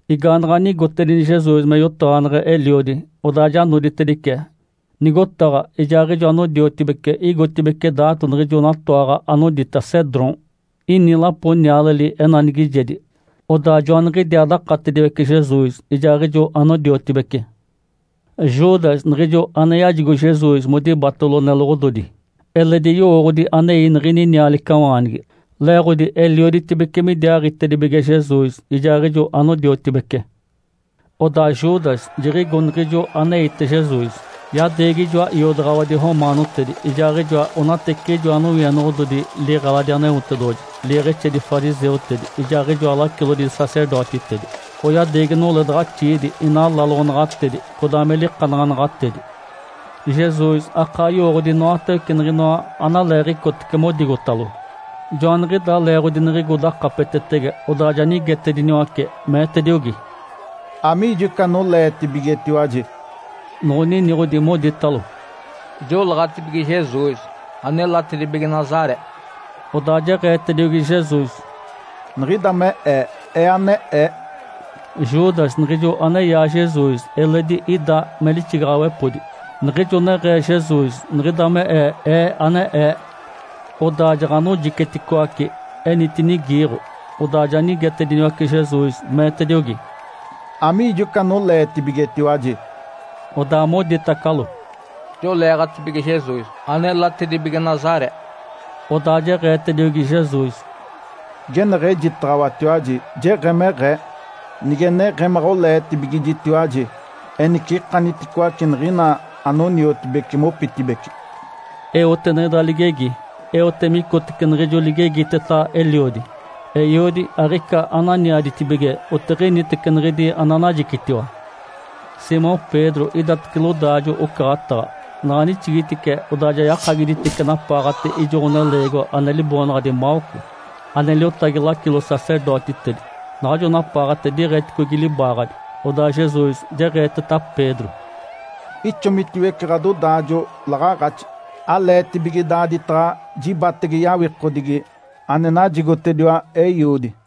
Igaanaɡ̶a nigotedini Jesus me yotaɡ̶aneɡ̶e Eliodi, odaa ja noditedice nigotaɡ̶a ijaaɡ̶ijo anodiotibece igotibeci daato niɡ̶ijo natoaɡ̶a anodita “Cedrom”. Ini lapo nialeli enanigijedi, odaa joaniɡ̶idiaa dakatediwece Jesus ijaaɡ̶ijo anodiotibece. Judas, niɡ̶ijo ane yajigo Jesus modibatalo neloɡ̶ododi, eledi yowooɡ̶odi anei niɡ̶ini nialicawaanigi, leeɡ̶odi elioditibece midiaaɡ̶itedibige Jesus ijaaɡ̶ijo anodiotibece. Odaa Judas jiɡ̶igo niɡ̶ijo aneite Jesus, yadeegi ijoa iodaɡ̶awadi romaanotedi ijaaɡ̶ijoa onateciɡ̶ijoa nowienoɡ̶ododi liɡ̶eladi Aneotedoɡ̶oji, liiɡ̶exedi fariseutedi ijaaɡ̶ijoa lacilodi sacerdotitedi. Oyadeegi noledaɡ̶axiidi inaa laloɡ̶onaɡ̶atedi, codaa me likanaɡ̶anaɡ̶atedi. Jesus akaa yowooɡ̶odi inoatawece niɡ̶inoa analeeɡ̶icotece modigotalo. Joaniɡ̶idaa leeɡ̶odi niɡ̶igo dakapetetege, odaa ja nigetediniwace, meetediogi, “Amiijo ica anoleetibigetiwaji?” Noɡ̶oniniɡ̶odi, moditalo, “Joleeɡ̶atibige Jesus anelatedibige Nazaré”. Odaa jeɡ̶eetediogi Jesus, “Niɡ̶ida me Ee, Ee ane Ee!” Judas, niɡ̶ijo aneyaa Jesus eledi ida me lixigaɡ̶awepodi. Niɡ̶ijo neɡ̶ee Jesus, “Niɡ̶ida me Ee, Ee ane Ee!”, odaa jaɡ̶anojiceticoace, enitinigi iiɡ̶o. Odaa ja nigetacediniwace Jesus, meetediogi, “Amiijo ica anoleetibigetiwaji?” Odaa moditacalo, “Joleeɡ̶atibige Jesus anelatedibige Nazaré”. Odaa jeɡ̶eetediogi Jesus, “Geneɡ̶ejitaɡ̶awatiwaji jeɡ̶emeɡ̶ee. Nige neɡ̶emaɡ̶a oleetibigijitiwaji, enice ikaniticoace niɡ̶ina anoniotibici mopitibeci”. Eote niɡ̶ida ligegi eote micotece niɡ̶ijo ligegiteta Eliodi, “Eiodi, aɡ̶ica ane aniaditibige otiɡ̶initece niɡ̶idi ananajicitiwa”. Simão Pedro idatace lodaajo-ocaɡ̶ataɡ̶a, naɡ̶a nixigitice, odaa ja yakagiditice napaaɡ̶ate ijo ɡ̶oneleegiwa ane liboonaɡ̶adi Malco, ane liotagi lacilo-sacerdotitedi. Naɡ̶ajo napaaɡ̶ate diiɡ̶eticogi libaaɡ̶adi. Odaa Jesus jeɡ̶eeteta Pedro, “Ixomitiwece ɡ̶adodaajo laɡ̶aaɡ̶axi! Aleetibige daaditaɡ̶a jibatege yawikodigi ane najigotediwa Eiodi?”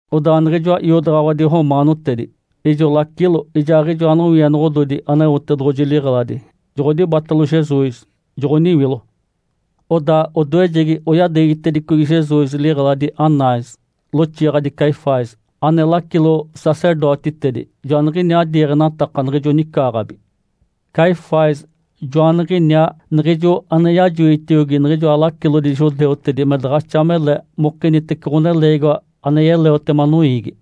Odaa niɡ̶ijoa iodaɡ̶awadi romaanotedi, ijo lacilo, ijaaɡ̶ijoa nowienoɡ̶ododi Aneotedoɡ̶oji liɡ̶eladi joɡ̶odibatalo Jesus, joɡ̶oniwilo. Odaa odoejegi oyadeegitedicogi Jesus liɡ̶eladi Anás, loxiiɡ̶adi Caifás, ane lacilo-sacerdotitedi. Joaniɡ̶iniaa diiɡ̶enataka niɡ̶ijo nicaaɡ̶abi. Caifás, joaniɡ̶iniaa niɡ̶ijo ane yajoitiogi niɡ̶ijoa lacilodi judeutedi me daɡ̶axa mele mokinitece ɡ̶oneleegiwa ane yeleotema noiigi.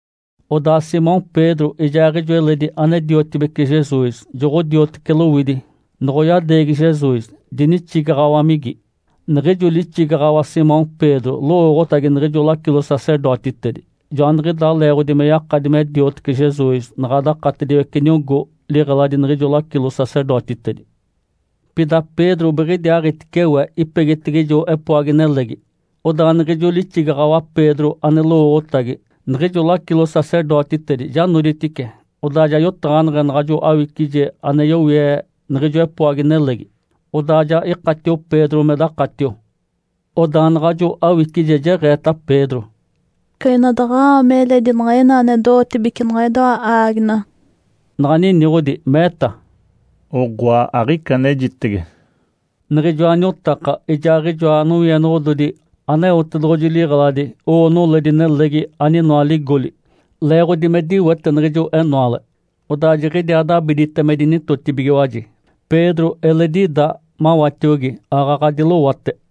Odaa Simão Pedro ijaaɡ̶ijo eledi ane-diotibece Jesus joɡ̶odiotece lowidi noɡ̶oyadeegi Jesus, dinixigaɡ̶awamigi. Niɡ̶ijo lixigaɡ̶awa Simão Pedro lowooɡ̶otagi niɡ̶ijo lacilo-sacerdotitedi. Joaniɡ̶idaa leeɡ̶odi me yakadi me diotiwece Jesus naɡ̶a dakatediwece niogó liɡ̶eladi niɡ̶ijo lacilo-sacerdotitedi. Pida Pedro biɡ̶idiaaɡ̶itice we, ipegitege ijo epoagi nelegi. Odaa niɡ̶ijo lixigaɡ̶awa Pedro ane lowooɡ̶otagi niɡ̶ijo lacilo-sacerdotitedi ja noditice, odaa ja yotaɡ̶aneɡ̶e naɡ̶ajo awicije ane yowie niɡ̶ijo epoagi nelegi. Odaa ja ikatio Pedro me dakatio. Odaa naɡ̶ajo awicije jeɡ̶eeta Pedro, “Ica ina daɡ̶a-aami eledi niɡ̶ina ane do-ootibece niɡ̶idoa aaginaɡ̶a.” Naɡ̶a niniɡ̶odi, meeta, “Oɡ̶oa, aɡ̶ica anejitege!” Niɡ̶ijoa niotaka ijaaɡ̶ijoa nowienoɡ̶ododi Aneotedoɡ̶oji liɡ̶eladi owo noledi nelegi aninoa ligoli, leeɡ̶odi me diwete niɡ̶ijo enoale. Odaa jiɡ̶idiaa dabidite me dinitotibigiwaji. Pedro eledi ida mawatiogi aaɡ̶aɡ̶a dilowate.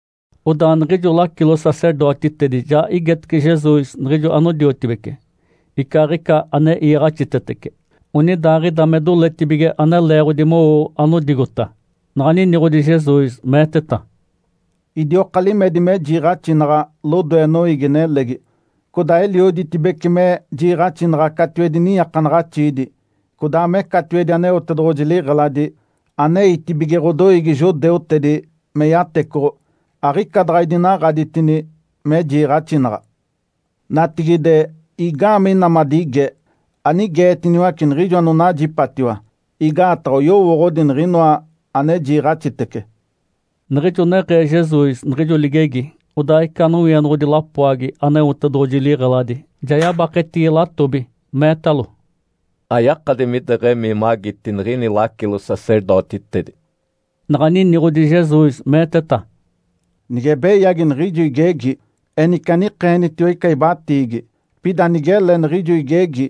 Odaa niɡ̶ijo lacilo-sacerdotitedi ja igetece Jesus niɡ̶ijo anodiotibece, icaaɡ̶ica ane iiɡ̶axitetece, onidaaɡ̶ida me doletibige ane leeɡ̶odi mowo anodigota. Naɡ̶a niniɡ̶odi Jesus, meeteta, “Idioka limedi me jiiɡ̶axinaɡ̶a lodoe noiigi-nelegi. Codaa elioditibece me jiiɡ̶axinaɡ̶a catiwedi niiakanaɡ̶axiidi, codaa me catiwedi Aneotedoɡ̶oji liɡ̶eladi, aneitibige ɡ̶odoiigi judeutedi me yatecoɡ̶o. Aɡ̶ica daɡ̶a idinaɡ̶aditini me jiiɡ̶axinaɡ̶a. Natigide, igaamee ina madigee? Anigeetiniwace niɡ̶ijo anonajipatiwa, igaataɡ̶a oyowooɡ̶odi niɡ̶inoa ane jiiɡ̶axitece”. Niɡ̶ijo neɡ̶ee Jesus niɡ̶ijo ligegi, odaa ica nowienoɡ̶odi lapoagi Aneotedoɡ̶oji liɡ̶eladi ja yabaketigi latobi, meetalo, “Ayakadi mideɡ̶emii magiti niɡ̶ini lacilo-sacerdotitedi”. Naɡ̶a niniɡ̶odi Jesus, meeteta, “Nige beyagi niɡ̶ijo igegi, enice anikeenitiwa ica ibatiigi. Pida nigele niɡ̶ijo igegi,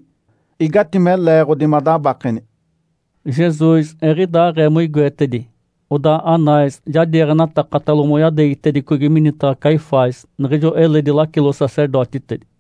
igatime leeɡ̶odi madabakeni?” Jesus eɡ̶idaaɡ̶ee moigoetedi, odaa Anás ja diiɡ̶enatakatalo moyadeegitedicogi minitaɡ̶a Caifás, niɡ̶ijo eledi lacilo-sacerdotitedi.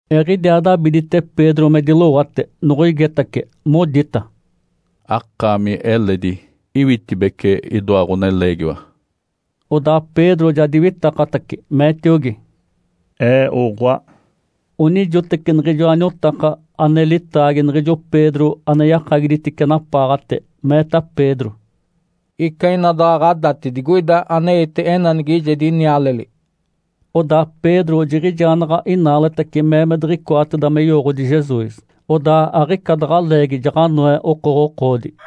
Eɡ̶idiaa dabidite Pedro me dilowate, noɡ̶oigetace, modita, “Akaami eledi iwitibece idoa ɡ̶oneleegiwa?” Odaa Pedro ja diwitakatace, meetiogi, “Ee oɡ̶oa!” Onijoteci niɡ̶ijoa niotaka ane litaagi niɡ̶ijo Pedro ane yakagiditice napaaɡ̶ate, meeta Pedro, “Ica ina daɡ̶a ɡ̶adati digoida aneite enanigijedi nialeli.” Odaa Pedro jiɡ̶ijaa naɡ̶a inaaletace mee me diɡ̶icoateda me yowooɡ̶odi Jesus. Odaa aɡ̶ica daɡ̶a leegi jaɡ̶anoe okoɡ̶okoodi.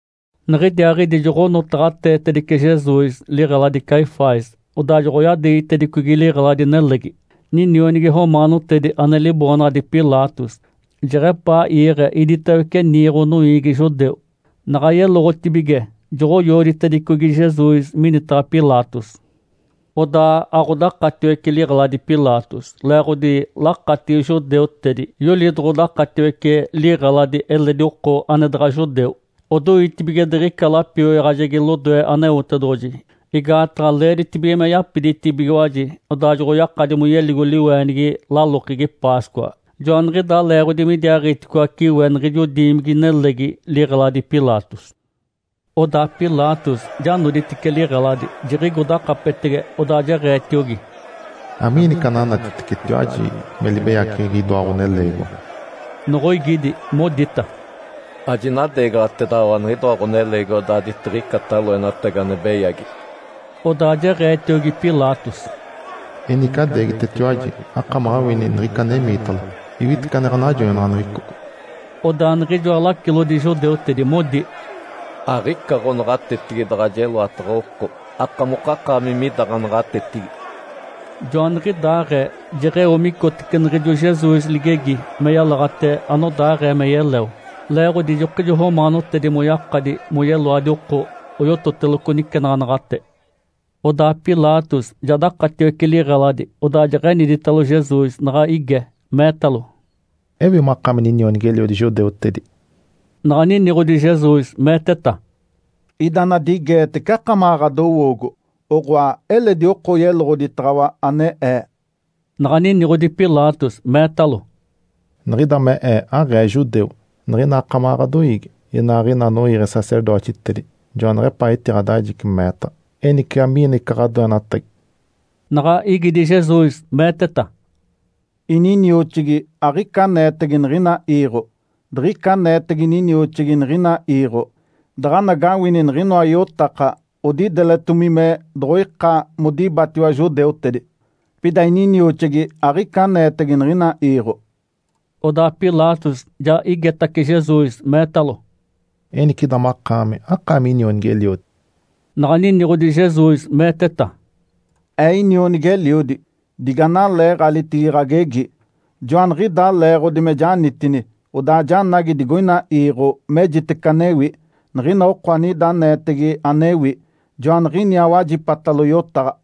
Niɡ̶idiaaɡ̶idi joɡ̶onotaɡ̶ateetedice Jesus liɡ̶eladi Caifás, odaa joɡ̶oyadeegitedicogi liɡ̶eladi-nelegi ninionigi romaanotedi ane liboonaɡ̶adi Pilatos, jeɡ̶epaa iiɡ̶e iditawece niiɡ̶o noiigi judeu. Naɡ̶a yeloɡ̶otibige, joɡ̶oyooditedicogi Jesus minitaɡ̶a Pilatos. Odaa aɡ̶odakatiwece liɡ̶eladi Pilatos, leeɡ̶odi lakatigi judeutedi yoli doɡ̶odakatiwece liɡ̶eladi eledi oko ane daɡ̶a judeu. Odoitibige diɡ̶ica lapioyaɡ̶ajegi lodoe Aneotedoɡ̶oji, igaataɡ̶a leeditibige me yapiditibigiwaji odaa joɡ̶oyakadi moyeligo liweenigi lalokegi Páscoa. Joaniɡ̶idaa leeɡ̶odi midiaaɡ̶iticoace we niɡ̶ijo diimigi-nelegi, liɡ̶eladi Pilatos. Odaa Pilatos ja noditice liɡ̶eladi, jiɡ̶igo dakapetege, odaa jeɡ̶eetiogi, “Amiini ica ananatitecetiwaji me libeyaceɡ̶egi idoa ɡ̶oneleegiwa?” Noɡ̶oigidi, modita, “Ajinadeegaɡ̶atedaɡ̶awa niɡ̶idoa ɡ̶oneleegiwa daaditiɡ̶icata loenatagi ane beyagi”. Odaa jeɡ̶eetiogi Pilatos, “Enice adeegitetiwaji, akamaɡ̶a awini niɡ̶ica anemiitalo, iwitece ane ɡ̶anajoinaɡ̶aneɡ̶eco”. Odaa niɡ̶ijoa lacilodi judeutedi modi, “Aɡ̶ica ɡ̶onaɡ̶atetigi daɡ̶a jeloataɡ̶a oko, akamokakaami mida ɡ̶anaɡ̶atetigi”. Joaniɡ̶idaaɡ̶ee, jeɡ̶eo micotece niɡ̶ijo Jesus ligegi, me yalaɡ̶ate anodaaɡ̶ee me yeleo. (Leeɡ̶odi ijokijo romaanotedi moyakadi moyeloadi oko oyototeloco nicenaɡ̶anaɡ̶ate.) Odaa Pilatos ja dakatiwece liɡ̶eladi, odaa jeɡ̶eniditalo Jesus, naɡ̶a ige, meetalo, “Ewi makaami ninionigi-eliodi judeutedi?” Naɡ̶a niniɡ̶odi Jesus, meeteta, “Ida anadigeetece akamaɡ̶a ɡ̶adowoogo? Oɡ̶oa, eledi oko yeloɡ̶oditaɡ̶awa ane Ee?” Naɡ̶a niniɡ̶odi Pilatos, meetalo, “Niɡ̶ida me ee, aɡ̶ee judeu! Niɡ̶ina akamaɡ̶a ɡ̶adoiigi inaaɡ̶ina anoiiɡ̶e sacerdotitedi joaneɡ̶epaa etiɡ̶adajici meetaɡ̶a. Enice amiini ica ɡ̶adoenatagi?” Naɡ̶a igidi Jesus, meeteta, “Ininioxigi aɡ̶ica aneetege niɡ̶ina iiɡ̶o. Diɡ̶ica aneetege ininioxigi niɡ̶ina iiɡ̶o, daɡ̶anagawini niɡ̶inoa iotaka odideletomi me doɡ̶oika modibatiwa judeutedi. Pida ininioxigi aɡ̶ica aneetege niɡ̶ina iiɡ̶o”. Odaa Pilatos ja igetace Jesus, meetalo, “Enice, ida makaami, akaami inionigi-eliodi?” Naɡ̶a niniɡ̶odi Jesus, meeteta, “Ee inionigi-eliodi, diganaleeɡ̶alitigi ɡ̶agegi. Joaniɡ̶idaa leeɡ̶odi me janitini, odaa ja janagi digoina iiɡ̶o mejitece anewi. Niɡ̶ina oko anida aneetege anewi, joaniɡ̶iniaa wajipatalo yotaɡ̶a”.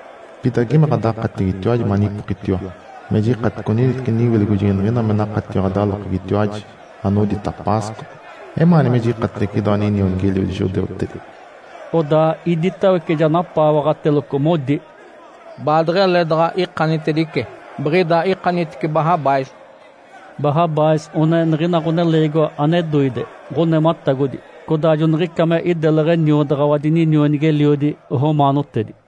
Pida geme ɡ̶adakatigitiwaji manipokitiwa me jikatice oniniteci niwilogojegi niɡ̶ina me nakatio ɡ̶adalokegitiwaji anodita Páscoa. Emaani me jikatedice idoa ninionigi-eliodi judeutedi?” Odaa iditawece ja napaawaɡ̶ataceloco modi, “Baadeɡ̶ele daɡ̶a ikanitedice. Biɡ̶ida ikanitice Barrabás!” Barrabás one niɡ̶ina ɡ̶oneleegiwa ane doide, ɡ̶onematagodi. (Codaa joniɡ̶ica me ideleɡ̶e niodaɡ̶awadi ninionigi-eliodi romaanotedi.)